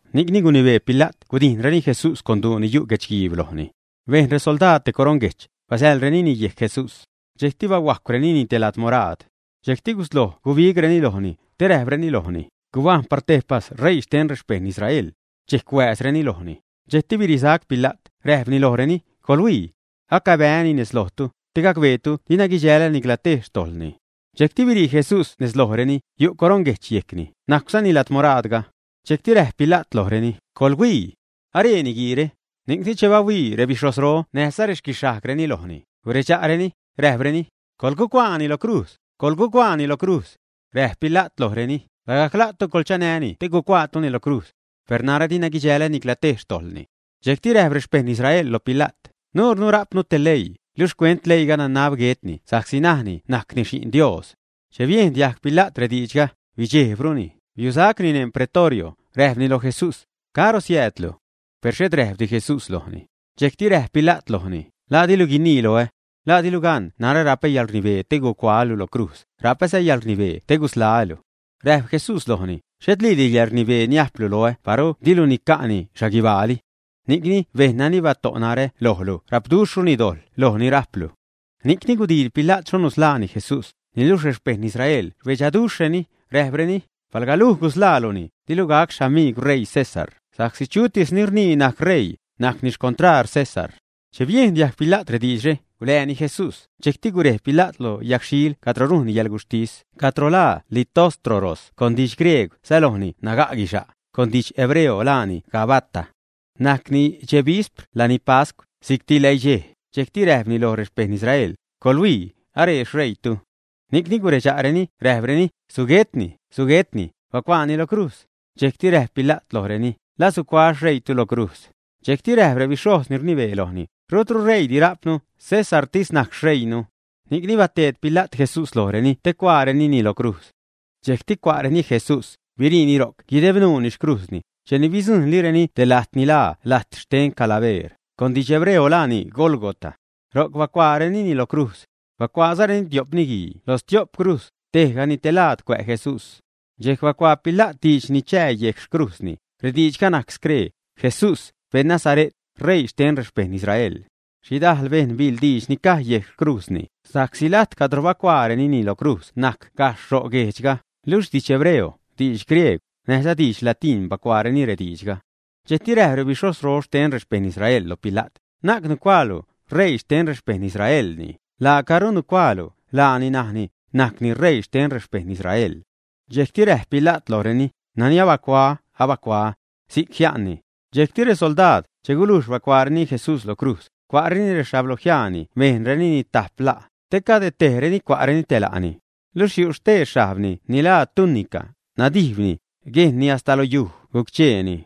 Ni'cni gunibee Pila't gudijnreni Jesús con duu ni yu' guechguiib lojni. Bejn resoldaad te coroṉguejch, bazaḻrenini yejc Jesús. Dxejcti bahuajcwrenini te ladmoraad. Dxejcti gusloj gubigreni lojni, te räjpreni lojni: ―¡Gubajṉ par tejpas R̲eii xten rexpejṉ Israel! Dxejc huääzreni lojni. Dxejcti birisac Pila't, räjpni lojreni: ―¡Coḻhuii! Acabää́ni nez lojtu, te gacbeetu dina guidxäl nicla tej xtojḻni. Dxejcti birii Jesús nez lojreni, yu' coroṉguejch yejcni, najcwzani ladmoraadga. Dxejcti räjp Pila't lojreni: ―¡Coḻhuii! ¡Aree niguiire! Ni'cni, che bahuii rebixhojzro näjza rexquixhajgreni lojni, guredxa'reni, räjpreni: ―¡Coḻgucuaani lo crujz! ¡Coḻgucuaani lo crujz! Räjp Pila't lojreni: ―Lagajc la'tu coḻchanäni te gucuaatuni lo crujz. Per narä dina guidxälä nicla tej xtojḻni. Dxejcti räjp rexpejṉ Israel lo Pila't: ―Nuurnu rajpnu te leii, luxh xcuent leiiga, nanab guetni sa'csi najni najcni Xi'n Dios. Che biejn diajg Pila't rediidxga, bidxejbruni, biusacni neṉ Pretorio, räjpni loj Jesús: ―¿Caro siäädlu? Per xhet räjpdi Jesús lojni. Dxejcti räjp Pila't lojni: ―¿La dilu guinii loä? ¿La dilu gan narä rapä yäḻrnibee te gucuaälu lo crujz, rapäza yäḻrnibee te gusḻaä́lu, ä? Räjp Jesús lojni: ―Xhetliidi yäḻrnibee niajplu loä paru dilu nica'ni xhaguibaali. Ni'cni bejṉ nani bato' narä lojlu rapduxhruni dojḻ loj ni rajplu. Ni'cni gudiil Pila't xho nusḻaani Jesús, niluxh rexpejṉ Israel rbedxaduxhrureni, räjpreni: ―Palga luj gusḻaaluni, dilu gac xamiigw ṟeii César, sa'csi chutis ni rnii najcni ṟeii, najcni xcontraar César. Che biejn diajg Pila't rediidxre, gulääni Jesús, dxejcti gurej Pila't lo yagxhiil cadro rujnni yäḻguxhtis, cadro laa Litóstroros con didx-griegw sälojni naga' guisa'c, con didx-hebreo laani Gabata. Najcni dxej vispr lani pascw, si'cti läidxej, dxejcti räjpni loj rexpejṉ Israel: ―Coḻhuii, aree xṟeiitu. Ni'cni guredxa'reni räjpreni: ―¡Suguetni! ¡Suguetni! ¡Bacuaani lo crujz! Dxejcti räjp Pila't lojreni: ―¿La sucuaä́ xṟeiitu lo crujz, ä? Dxejcti räjp rebixhojz ni rnibee lojni: ―Rutru ṟeiidi rajpnu, Césartis najc xṟeiinu. Ni'cni bateed Pila't Jesús lojreni te chacuaarenini lo crujz. Dxejcti cua'reni Jesús, biriini ro'c guideb nuuni xcrujzni, cheni bidzujṉlireni te lajt ni laa lajt xten Calabeer, con didx hebreo laani Gólgota. Ro'c bacuaarenini lo crujz. Bacuaazareni tio'p niguii lo stio'p crujz, tejgani te laad cuä' Jesús. Dxejc bacuaa Pila't diidx ni chää yejc xcrujzni; rediidxga najc scree: “Jesús, beṉ Nazare't, R̲eii xten rexpejṉ Israel.” Xhidajl bejṉ biḻ diidx ni caj yejc xcrujzni, sa'csi lajt cadro bacuaarenini lo crujz najc gajxh ro' guejdxga, luxh didx hebreo, diidx griegw, näjza didx latiṉ bacuaareni rediidxga. Dxejcti räjp rebixhojzro xten rexpejṉ Israel loj Pila't: ―Na'c nucuaalu: “R̲eii xten rexpejṉ Israelni”, laacaru nacuaalu: “Laani najni, najcni ṟeii xten rexpejṉ Israel”. Dxejcti räjp Pila't lojreni: ―Nani abacuaä́, abacuaä́. Si'c jia'nni. Dxejcti resoldaad, che gulujx bacuaareni Jesús lo crujz, cua'reni rexhablojiaani bejnrenini tajp la', te cade tejreni cua'reni te la'ni. Luxh yu' stee xhajbni ni laa tunica, nadijbni, guejnni hasta lo yuj guc-cheeni.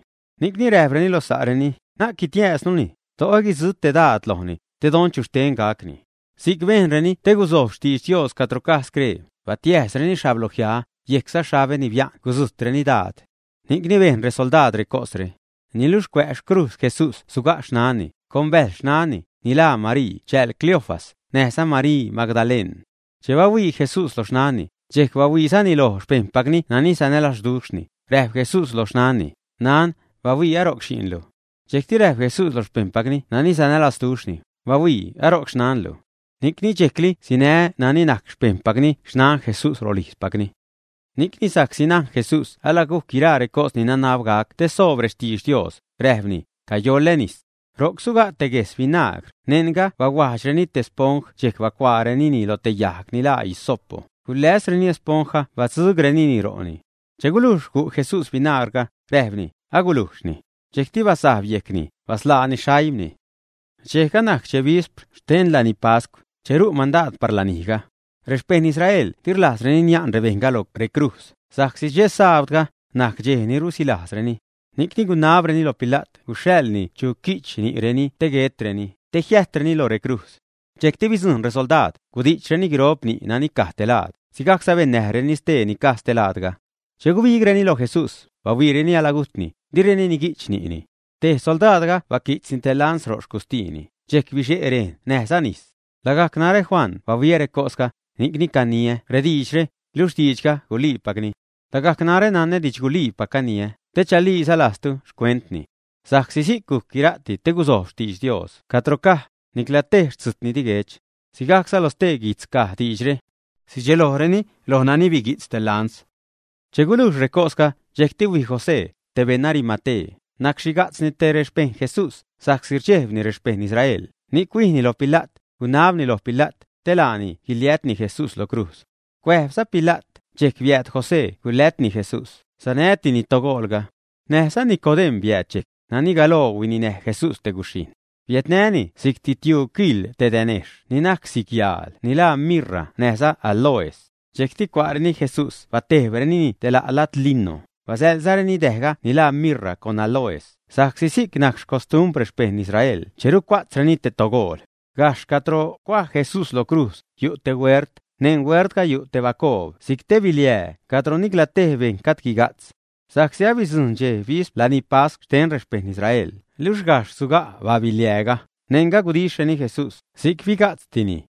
Ni'cni räjpreni lo sa'reni: ―Na'c guitiäjznuni; do'o guidzujtnu te daad lojni, te don chu xten gacni. Si'c bejnreni te gusojb xtiidx Dios cadro caj scree: “Batiäjsreni xhablojiaä; yejcza xhabä ni bia'n gudzujtreni daad.” Ni'cni bejn resoldaad recosre. Niluxh cuä' xcrujz Jesús suga' xnanni, con bäjl xnanni, ni laa Marii chääl Cleofas, näjza Marii Magdaleṉ. Che bahuii Jesús loj xnanni, dxejc bahuiizani loj xpejṉpacni nani sanälazduxhni, räjp Jesús loj xnanni: ―Nan, ¡bahuii, aro'c xi'nlu! Dxejcti räjp Jesús loj xpejṉpacni nani sanälazduxhni: ―¡Bahuii, aro'c xnanlu! Ni'cni dxejcli sinä nani najc xpejṉpacni xnan Jesús rolijzpacni. Ni'cni, sa'csi najn Jesús alagujc guiraa recos ni nanab gac te soob rextidx Dios, räjpni: ―Cayoḻä nis. Ro'c suga' te guejs vinagr, neṉga bahuajdxreni te esponj dxejc bacuaarenini lo te yajg ni laa hisopo, guläsreni esponjga batzugrenini ro'ni. Che gulujx gu' Jesús vinagrga, räjpni: ―Agulujxni. Dxejcti basajb yejcni, basḻaani xaimni. Dxejga najc dxe vispr xte lani pascw, che ru' mandaad par lanijga. Rexpejṉ Israel di rlajzreni nia'n rebejṉga lo recrujz, sa'csi dxe sabdga najc dxej ni rusilajzreni. Ni'cni gunabreni lo Pila't guxhaḻni chu qui'ch ni'reni te guetreni, te jiäjtreni loj recrujz. Dxejcti bidzujṉ resoldaad, gudi'chreni guiro'p ni' nani caj te laad, sigajcza bennäjreni stee ni caj ste laadga. Che gubigreni lo Jesús, bahuiireni alagujtni, direni nigui'ch ni'ni. Tej soldaadga baqui'tzni te lans ro' xcustiini, dxejc bixe' rejn näjza nis. Lagajc narä Juan bahuiä recosga, ni'cni caniä rediidxre, luxh diidxga guliipacni. Lagajc narä nanä didxguliipac caniä, te chaliiza lajztu xcuentni. Sa'csi si'c gujc guira'ti, te guzojb xtidx Dios cadro caj: “Nicla tej xtzujtni di guech.” Sigajcza lo stee guijtz caj diidxre: “Sidxelojreni loj nani biguijtz te lans.” Che gulujx recosga, dxejcti huij José, te beṉ Arimatea, nacxhiga'tzni te xpejṉ Jesús, sa'csi rdxejbni rexpejṉ Israel, ni'c huijni loj Pila't, gunabni loj Pila't te laani guiliätni Jesús lo crujz. Cuäjbza Pila't, dxejc biääd José gulätni Jesús, sanätini togoolga. Näjza Nicodem̲ biääd dxejc, nani galoo huininäj Jesús te guxhijṉ. Biädnäni si'cti tiuu kiḻ te dänejxh ni najc si'c yaal ni laa mirra näjza áloes. Dxejcti cua'reni Jesús batejbrenini te la' lad lino, basälzareni däjga ni laa mirra con áloes, sa'csi si'c najc xcostumbr rexpejṉ Israel che rucua'tzreni te togool. Gajxh cadro cuaj Jesús lo crujz, yu' te huert, neṉ huertga yu' te bacoob si'c te biliää, cadro nicla tej bejṉ gajd guiga'tz. Sa'csi abidzujṉ dxej vispr lani pascw xten rexpejṉ Israel, luxh gajxh suga' biliääga, neṉga gudixhreni Jesús; si'c biga'tztini.